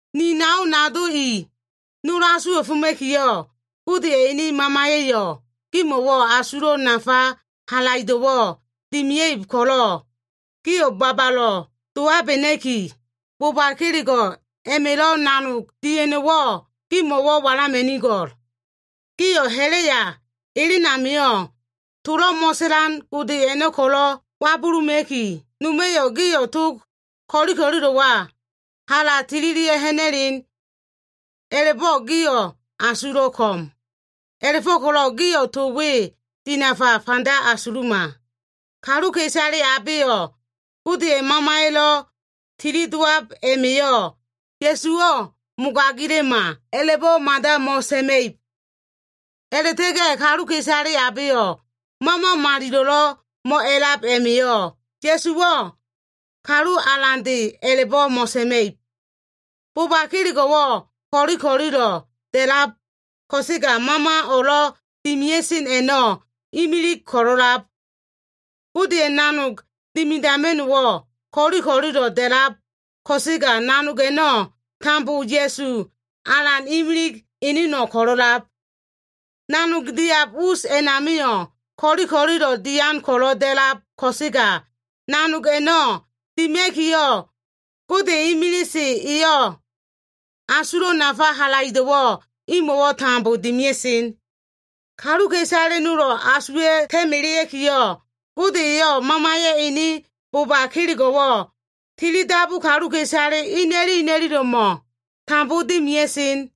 Ni nao nado i, nol asuwa꞉foma꞉kiyo꞉ Godeya꞉ ene Mamaya꞉yo꞉ gimo꞉wo꞉ asulo꞉ nafa halaido꞉wo꞉ dimia꞉ib ko꞉lo꞉, gio꞉ babalo꞉ dowabena꞉ki, boba kelego꞉ a꞉ma꞉lo꞉ nanog dia꞉no꞉wo꞉ gimo꞉ walama꞉nigo꞉l. Gio꞉ ha꞉la꞉ya elen amio꞉, tolo꞉ mo꞉sa꞉lan gode a꞉no꞉ ko꞉lo꞉ wabuluma꞉ki, noma꞉yo꞉ gio꞉ tog ko꞉li ko꞉lilo꞉wa hala tililia꞉ ha꞉na꞉len. A꞉la꞉bo꞉ gio꞉ asulo꞉ ko꞉m. A꞉la꞉fo꞉ko꞉lo꞉ gio꞉ to we dinafa fanda asuluma. Kaluka꞉isale abeyo꞉ Godeya꞉ Mamaya꞉lo꞉ tili dowab a꞉ma꞉yo꞉, “Ya꞉suwo꞉ mogagila꞉ma” a꞉la꞉bo꞉ mada mo꞉sa꞉ma꞉ib. A꞉la꞉ta꞉ga꞉ kaluka꞉isale abeyo꞉ Mama Malilo꞉lo꞉ mo꞉a꞉lab a꞉ma꞉yo꞉, “Ya꞉suwo꞉ Kalu Alande” a꞉la꞉bo꞉ mo꞉sa꞉ma꞉ib. Boba kelego꞉wo꞉ ko꞉li ko꞉lilo꞉ da꞉lab, ko꞉sega Mama o꞉lo꞉ dimia꞉sen a꞉no꞉ imilig ko꞉lo꞉lab. Godeya꞉ nanog dimidama꞉no꞉wo꞉ ko꞉li ko꞉lilo꞉ da꞉lab ko꞉sega, nanog a꞉no꞉ tambo Ya꞉su Alan imilig eneno꞉ ko꞉lo꞉lab. Nanog diab us a꞉namio꞉ ko꞉li ko꞉lilo꞉ dian ko꞉lo꞉ da꞉lab, ko꞉sega nanog a꞉no꞉ dima꞉kiyo꞉, Gode imilise eyo꞉ asulo꞉ nafa halaido꞉wo꞉ imo꞉wo꞉ tambo dimia꞉sen. Kaluka꞉isale nolo꞉ asuwa꞉ta꞉ melea꞉kiyo꞉, Gode eyo꞉ Mamaya꞉ ene boba kelego꞉wo꞉ tili dabu kaluka꞉isale ina꞉lilo꞉mo꞉wo꞉ tambo dimia꞉sen.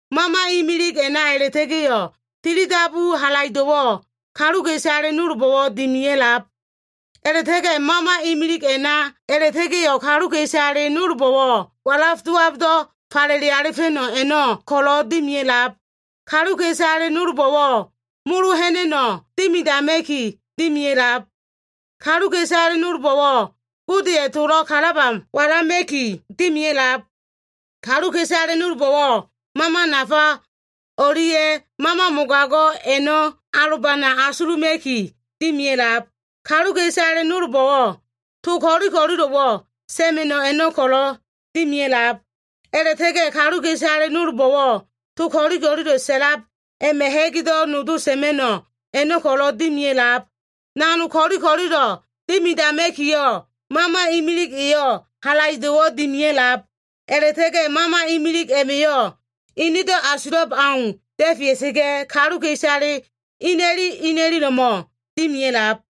Mama imilig a꞉na a꞉la꞉ta꞉ga꞉yo꞉ tili dabu halaido꞉wo꞉ kaluka꞉isale nolbo꞉wo꞉ dimia꞉lab. A꞉la꞉ta꞉ga꞉ Mama imilig a꞉na a꞉la꞉ta꞉ga꞉yo꞉ kaluka꞉isale nolbo꞉wo꞉ walaf dowabdo꞉ falele alifa꞉no꞉ a꞉no꞉ ko꞉lo꞉ dimia꞉lab. Kaluka꞉isale nolbo꞉wo꞉ molo ha꞉na꞉no꞉ dimidama꞉ki dimia꞉lab. Kaluka꞉isale nolbo꞉wo꞉ Godeya꞉ towo꞉ kalaba walama꞉ki dimia꞉lab. Kaluka꞉isale nolbo꞉wo꞉ mama nafa o꞉lia꞉ mama mogago꞉ a꞉no꞉ alobana asuluma꞉ki dimia꞉lab. Kaluka꞉isale nolbo꞉wo꞉ to ko꞉li ko꞉lilo꞉wo꞉ sa꞉ma꞉no꞉ a꞉no꞉ ko꞉lo꞉ dimia꞉lab. A꞉la꞉ta꞉ga꞉ kaluka꞉isale nolbo꞉wo꞉ to ko꞉lilo꞉ sa꞉lab a꞉ma꞉ ha꞉gdo꞉ nodo sa꞉ma꞉no꞉ a꞉no꞉ ko꞉lo꞉ dimia꞉lab. Nanog ko꞉li ko꞉lilo꞉ dimidama꞉kiyo꞉, Mama imilig eyo꞉ halaido꞉wo꞉ dimia꞉lab. A꞉la꞉ta꞉ga꞉ Mama imilig a꞉ma꞉yo꞉ enedo꞉ asulab au da꞉fea꞉sa꞉ga꞉, kaluka꞉isale ina꞉li ina꞉lilo꞉mo꞉ dimia꞉lab.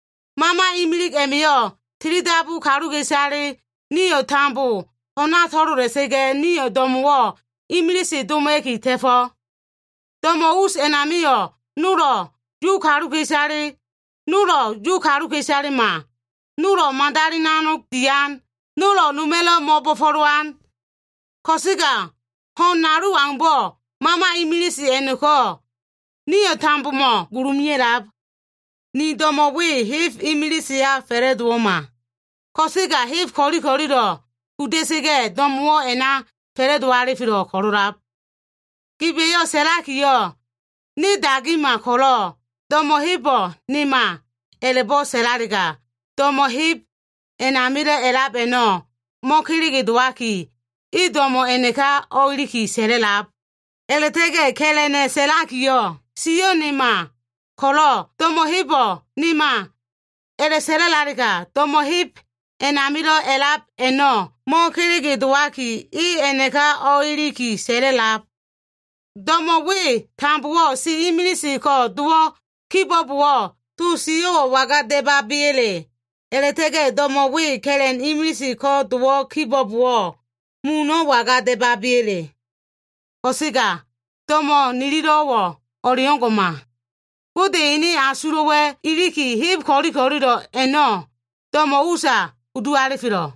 Mama imilig a꞉ma꞉yo꞉ tili dabu kaluka꞉isale nio꞉ tambo ho꞉na to꞉lola꞉sa꞉ga꞉, nio꞉ do꞉mo꞉wo꞉ imilise doma꞉ki ta꞉fo꞉. Do꞉mo꞉ us a꞉namio꞉, nolo꞉ Yu kaluka꞉isale, nolo꞉ Yu kaluka꞉isalema, nolo꞉ madali nanog dian, nolo꞉ noma꞉lo꞉ mo꞉bo꞉fo꞉lowan. Ko꞉sega ho꞉n nalu aumbo꞉, Mama imilise a꞉no꞉ko꞉ nio꞉ tambomo꞉ gulu mea꞉lab. Ni do꞉mo꞉ we heb imiliseya fa꞉la꞉dowo꞉ma. Ko꞉sega heb ko꞉li ko꞉lilo꞉ kuda꞉sa꞉ga꞉ do꞉mo꞉wo꞉ a꞉na fa꞉la꞉do alifelo꞉ ko꞉lo꞉lab. Giba꞉yo꞉ sa꞉lakiyo꞉, “Ne dagima ko꞉lo꞉, do꞉mo꞉ hebo꞉ nema” a꞉la꞉bo꞉ sa꞉lalega, do꞉mo꞉ heb a꞉namilo꞉ a꞉lab a꞉no꞉ mo꞉kelege dowaki, e do꞉mo꞉ a꞉naka o꞉iliki sa꞉lab. A꞉la꞉ta꞉ga꞉ ka꞉la꞉na꞉ sa꞉lakiyo꞉, “Sio꞉ nema ko꞉lo꞉, do꞉mo꞉ hebo꞉ nema” a꞉la꞉sa꞉la꞉lalega, do꞉mo꞉ heb a꞉namilo꞉ a꞉lab a꞉no꞉ mo꞉kelege dowaki, e a꞉naka o꞉iliki sa꞉la꞉lab. Do꞉mo꞉ we tambowo꞉ si imilise ko꞉ dowo꞉ kibo꞉bowo꞉, to sio꞉wo꞉ waga da꞉baba꞉ya꞉le? A꞉la꞉ta꞉ga꞉ do꞉mo꞉ we ka꞉la꞉n imilise ko꞉ dowo꞉ kibo꞉bowo꞉, muno꞉ waga da꞉baba꞉ya꞉le? Ko꞉sega do꞉mo꞉ nilo꞉wo꞉ o꞉leo꞉ngo꞉ma. Gode ene asulo꞉wa꞉ iliki, heb ko꞉li ko꞉lilo꞉ a꞉no꞉ do꞉mo꞉ usa kudu alifelo꞉.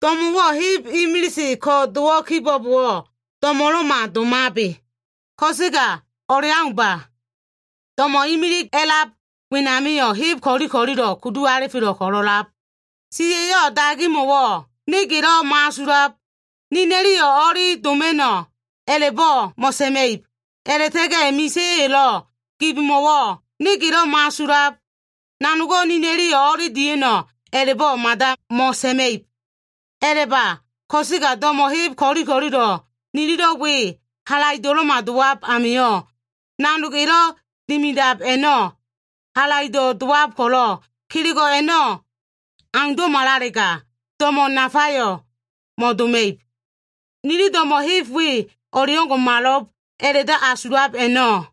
Do꞉mo꞉wo꞉ heb imilise ko꞉ dowo꞉ kibo꞉bowo꞉, do꞉mo꞉lo꞉ma domabe. Ko꞉sega o꞉leaumba. Do꞉mo꞉ imilig a꞉lab wenamio꞉ heb ko꞉li ko꞉lilo꞉ kudu alifelo꞉ ko꞉lo꞉ a꞉lab. Siya꞉yo꞉ dagimo꞉wo꞉, “Ne gelo꞉ mo꞉asulab. Nina꞉liyo꞉ o꞉li doma꞉no꞉,” a꞉la꞉bo꞉ mo꞉sa꞉ma꞉ib. A꞉la꞉ta꞉ga꞉ misa꞉ya꞉yo꞉lo꞉ gibmo꞉wo꞉, “Ne gelo꞉ mo꞉asulab. Nanogo꞉ nina꞉liyo꞉ o꞉li dia꞉no꞉,” a꞉la꞉bo꞉ mada mo꞉sa꞉ma꞉ib. A꞉la꞉ba ko꞉sega do꞉mo꞉ heb ko꞉li ko꞉lilo꞉ nililo꞉ we halaido꞉lo꞉ma dowab a꞉ma꞉yo꞉, nanog elo꞉ dimidab a꞉no꞉ halaido꞉ dowab ko꞉lo꞉, kelego꞉ a꞉no꞉ aundo꞉malalega, do꞉mo꞉ nafayo꞉ mo꞉doma꞉ib Nili do꞉mo꞉ heb nol we o꞉ngo꞉malo꞉b a꞉la꞉do꞉ asulab a꞉no꞉,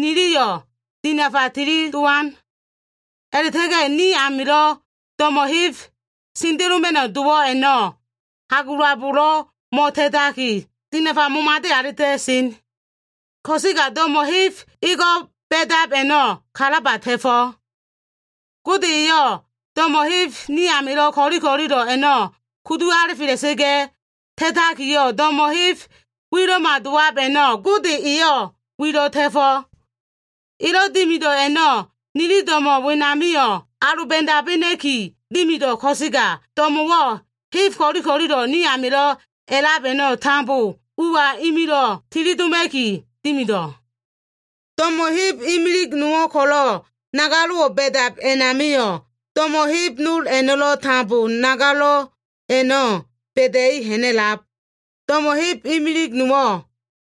niliyo꞉ dinafa tili dowan. A꞉la꞉ta꞉ga꞉ ni amilo꞉ do꞉mo꞉ heb sendeloma꞉no꞉ dowo꞉ a꞉no꞉ hagulabolo꞉ mo꞉ta꞉taki, dinafa momade alita꞉sen. Ko꞉sega do꞉mo꞉ heb ego꞉ ba꞉dab a꞉no꞉, kalaba ta꞉fo꞉. Gode eyo꞉ do꞉mo꞉ heb ni amilo꞉ ko꞉li ko꞉lilo꞉ a꞉no꞉ kudu alifela꞉sa꞉ga꞉ ta꞉takiyo꞉, do꞉mo꞉ heb wilo꞉ma dowab a꞉no꞉ Gode eyo꞉ wilo꞉ ta꞉fo꞉. Elo꞉ dimido꞉ a꞉no꞉, nili do꞉mo꞉ wenamio꞉ aloba꞉dabena꞉ki dimido꞉. Ko꞉sega do꞉mo꞉wo꞉ heb ko꞉li ko꞉lilo꞉ ni amilo꞉ a꞉lab a꞉no꞉ tambo ua imilo꞉ tili doma꞉ki dimido꞉. Do꞉mo꞉ heb imilig nowo꞉ ko꞉lo꞉ nagalo꞉wo꞉ ba꞉dab a꞉namio꞉, do꞉mo꞉ heb nol a꞉no꞉lo꞉ tambo nagalo꞉ a꞉no꞉ ba꞉da꞉i ha꞉na꞉lab. Do꞉mo꞉ heb imilig nowo꞉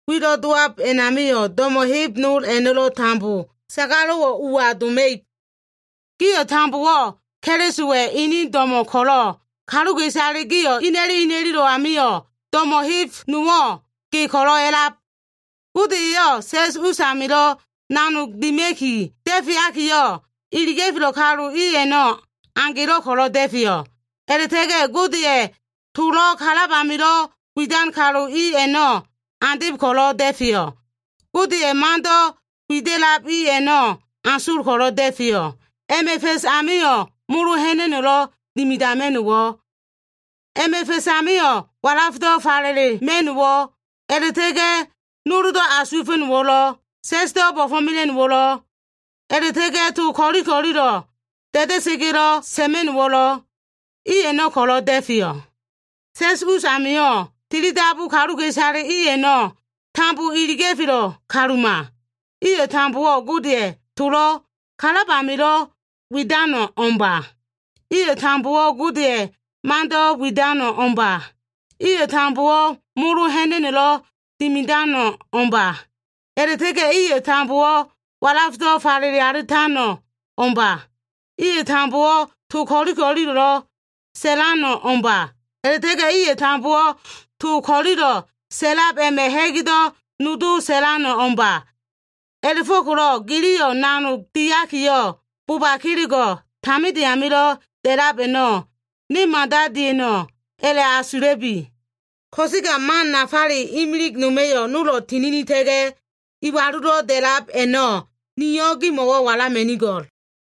wilo꞉ dowab a꞉namio꞉, do꞉mo꞉ heb nol a꞉no꞉lo꞉ tambo sagalo꞉wo꞉ ua doma꞉ib. Gio꞉ tambowo꞉ Kelisowa꞉ ene do꞉mo꞉ ko꞉lo꞉, kaluka꞉isale gio꞉ ina꞉li ina꞉lilo꞉ amio꞉ do꞉mo꞉ heb nowo꞉ ge ko꞉lo꞉ a꞉lab. Gode eyo꞉ sa꞉s us amilo꞉ nanogo꞉ dima꞉ki da꞉feakiyo꞉, iliga꞉felo꞉ kalu i a꞉no꞉ agelo꞉ ko꞉lo꞉ da꞉feyo꞉. A꞉la꞉ta꞉ga꞉ Godeya꞉ tolo꞉ kalab amilo꞉ widan kalu i a꞉no꞉ andeb ko꞉lo꞉ da꞉feyo꞉. Godeya꞉ mando꞉ wida꞉lab i a꞉no꞉ asol ko꞉lo꞉ da꞉feyo꞉. A꞉ma꞉ fa꞉s amio꞉, molo ha꞉na꞉no꞉lo꞉ dimidama꞉no꞉wo꞉. A꞉ma꞉ fa꞉s amio꞉ walafdo꞉ falelema꞉no꞉wo꞉, a꞉la꞉ta꞉ga꞉ noldo꞉ asuwa꞉fa꞉no꞉wo꞉lo꞉, sa꞉sdo꞉ bo꞉fo꞉mela꞉no꞉wo꞉lo꞉, a꞉la꞉ta꞉ga꞉ to ko꞉li ko꞉lilo꞉ da꞉da꞉sa꞉ga꞉lo꞉ sa꞉ma꞉no꞉wo꞉lo꞉, i a꞉no꞉ ko꞉lo꞉ da꞉feyo꞉. Sa꞉s us amio꞉, tili dabu kaluka꞉isale i a꞉no꞉ tambo iliga꞉felo꞉ kaluma. Iyo꞉ tambowo꞉ Godeya꞉ tolo꞉ kalab amilo꞉ widano꞉ o꞉mba. Iyo꞉ tambowo꞉ Godeya꞉ mando꞉ widano꞉ o꞉mba. Iyo꞉ tambowo꞉ molo ha꞉na꞉no꞉lo꞉ dimidano꞉ o꞉mba. A꞉la꞉ta꞉ga꞉ iyo꞉ tambowo꞉ walafdo꞉ falele alitano꞉ o꞉mba. Iyo꞉ tambowo꞉ to ko꞉li ko꞉lilo꞉lo꞉ sa꞉lano꞉ o꞉mba. A꞉la꞉ta꞉ga꞉ iyo꞉ tambowo꞉ to ko꞉lilo꞉ sa꞉lab a꞉ma꞉ ha꞉gdo꞉ nodo sa꞉lano꞉ o꞉mba. A꞉la꞉go꞉ko꞉lo꞉ giliyo꞉ nanog diakiyo꞉, boba kelego꞉ taminde amilo꞉ da꞉lab a꞉no꞉ ne mada dia꞉no꞉ a꞉la꞉asula꞉bi. Ko꞉sega man nafale imilig noma꞉yo꞉ nolo꞉ tininita꞉ga꞉ iwalulo꞉ da꞉lab a꞉no꞉, niyo꞉ gimo꞉ walama꞉nigo꞉l.